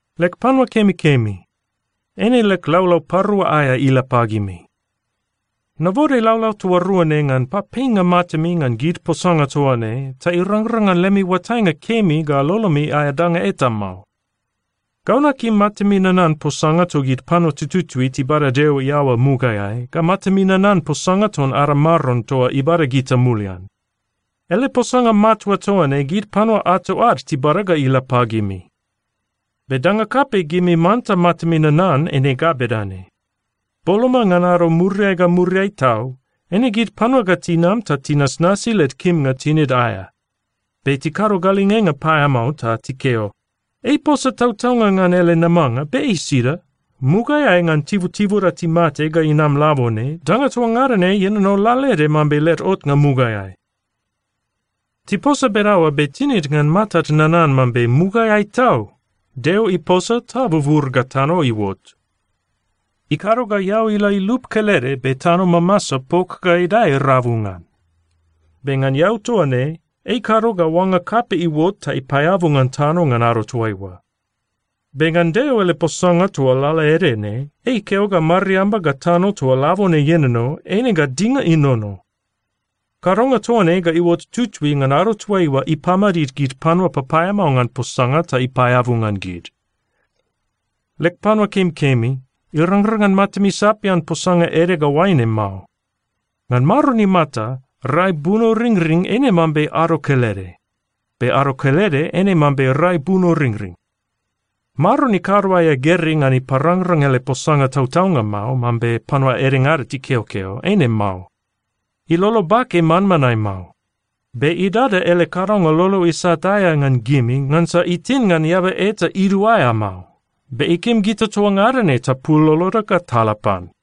Leg panua kemikemi, eine leg laulau parua aea ila pagimi. Nabode laulau toa rua ne ngan papeinga matami ngan gid posanga toa ne ta irangrang ngan lemi oatainga kemi ga lolomi aea danga eta mao. Gau nakim matami nanan posanga togid panua tututui tibada Deo iaoa mugaeai, ga matami nanan posanga ton ada Maron toa ibada gita mulian. Ele posanga matua toa ne, gid panua ato ad tibada ga ila pagimi. Be danga kapei gimi manta matami nanan eine ga bedane: Boloma ngan ado muriai ga muriai tau, eine gid panua ga tinam ta tinasnasi led kimnga tinid aea, be tikado galingenga paeamao ta tikeo, “Ei iposa tautaunga ngan ele namanga, be ei sida? Mugaeai ngan tibutibuda timate ga inam labone, danga toa ngada ne ienono lalaede mambe led otnga mugaeai.” Tiposa bedaoa be tinid ngan matad nanan mambe mugaeai tau Deo iposa ta bubur ga tano iuot. Ikado ga eau ila ilup kelede, be tano mamasa pok ga idae rabu ngan. Be ngan eau toa ne, ei ikado ga oanga kapei iuot ta ipaeabu ngan tano ngan ado toaiua. Be ngan Deo ele posanga toa lalaede ne, ei ikeo ga mariamba ga tano toa labone ienono, eine ga dinga inono. Kadonga toa ne ga iuot tutui ngan ado toaiua ipamadid gid panua papaeamao ngan posanga ta ipaeabu ngan gid. Leg panua kemikemi, irangrang ngan matami sapian posanga ede ga oaine mao: Ngan Maron imata, rai bunoringring eine mambe ado kelede, be ado kelede eine mambe rai bunoringring. Maron ikado aea gerei ngan iparangrang ele posanga tautaunga mao, mambe panua edengada tikeokeo. Eine mao. Ilolo bake manmanae mao. Be idada ele kadonga lolo isat aea ngan gimi ngansa itin ngan eaba eta iduaea mao, be ikim gita toa ngada ne tapul loloda ga tala pan.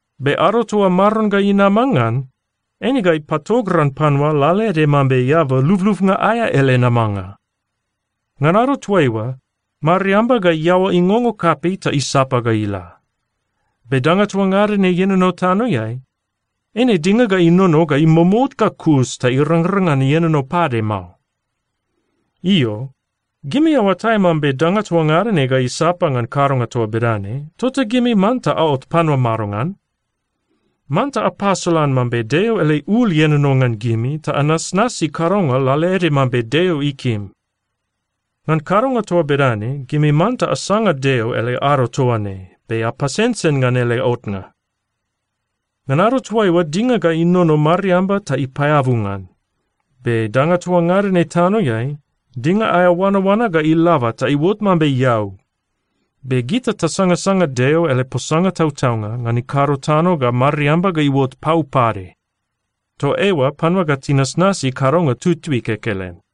Be ado toa Maron ga inama ngan, eine ga ipatogran panua lalaede mambe eaba lublubnga aea ele namanga. Ngan ado toaiua, mariamba ga iaoa ingongo kapei ta isapa ga ila. Be danga toa ngada ne ienono tanoeai, eine dinga ga inono ga imomout ga kus ta irangrang ngan ienono pade mao. Io, gimi aoatai mambe danga toa ngada ne ga isapa ngan kadonga toa bedane, tota gimi manta aot panua madongan? Manta apasolan mambe Deo ele ul ienono ngan gimi ta anasnasi kadonga lalaede mambe Deo ikim. Ngan kadonga toa bedane, gimi manta asanga Deo ele ado toa ne be apasensen ngan ele otnga. Ngan ado toaiua, dinga ga inono mariamba ta ipaeabu ngan. Be danga toa ngada ne tanoeai, dinga aea oanaoana ga ilaba ta iuot mambe eau. Be gita tasangasanga Deo ele posanga tautaunga ngan ikado tano ga mariamba ga iuot pau pade. Toa eoa panua ga tinasnasi kadonga tutui kekelen.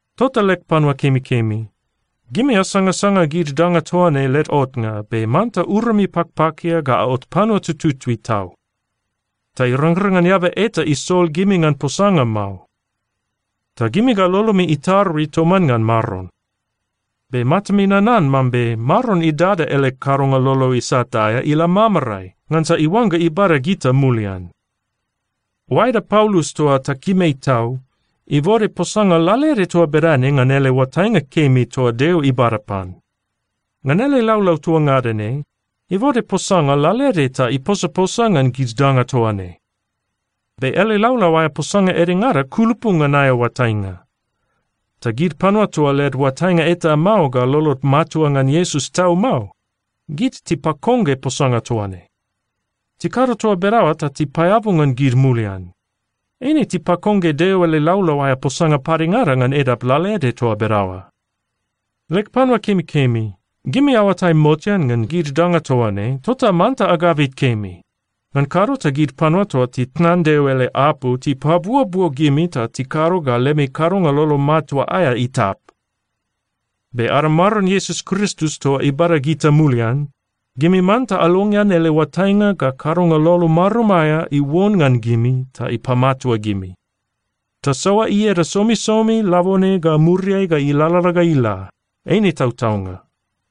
Tota leg panua kemikemi, gimi asangasanga gid danga toa ne led otnga, be manta urami pakpakia ga aot panua tututui tau, ta irangrang ngan eaba eta isol gimi ngan posanga mao. Ta gimi ga lolomi itarui toman ngan Maron. Be matami nanan mambe Maron idada ele kadonga lolo isat aea ila mamarae ngansa iuangga ibada gita mulian. Oaeda Paulus toa takim ei tau ibode posanga lalaede toa bedane ngan oatainga kemi toa Deo ibada pan. Ngan ele laulau toa ngada ne, ibode posanga lalaede ta iposaposa ngan gid danga toa ne. Be ele laulau aea posanga edengada kulupu ngan aea oatainga, ta gid panua toa led oatainga eta mao ga lolod matua ngan Iesus tau mao, gid tipakongge posanga toa ne. Tikado toa bedaoa ta tipaeabu ngan gid mulian. Eine tipakongge Deo ele laulau aea posanga padengada ngan edap lalaede toa bedaoa. Leg panua kemikemi, gimi aoatai motean ngan gid danga toa ne, tota manta agabit kemi, ngan kado ta gid panua toa titnan Deo ele apu tipabuobuo gimi ta tikado ga lemi kadonga lolo matua aea itap. Be ada Maron Iesus Kristus toa ibada gita mulian, gimi manta alongean ele oatainga ga kadonga lolo marum aea iuon ngan gimi ta ipamatua gimi. Tasoa ieda somisomi labone ga muriai ga ilalala ga ila. Eine tautaunga.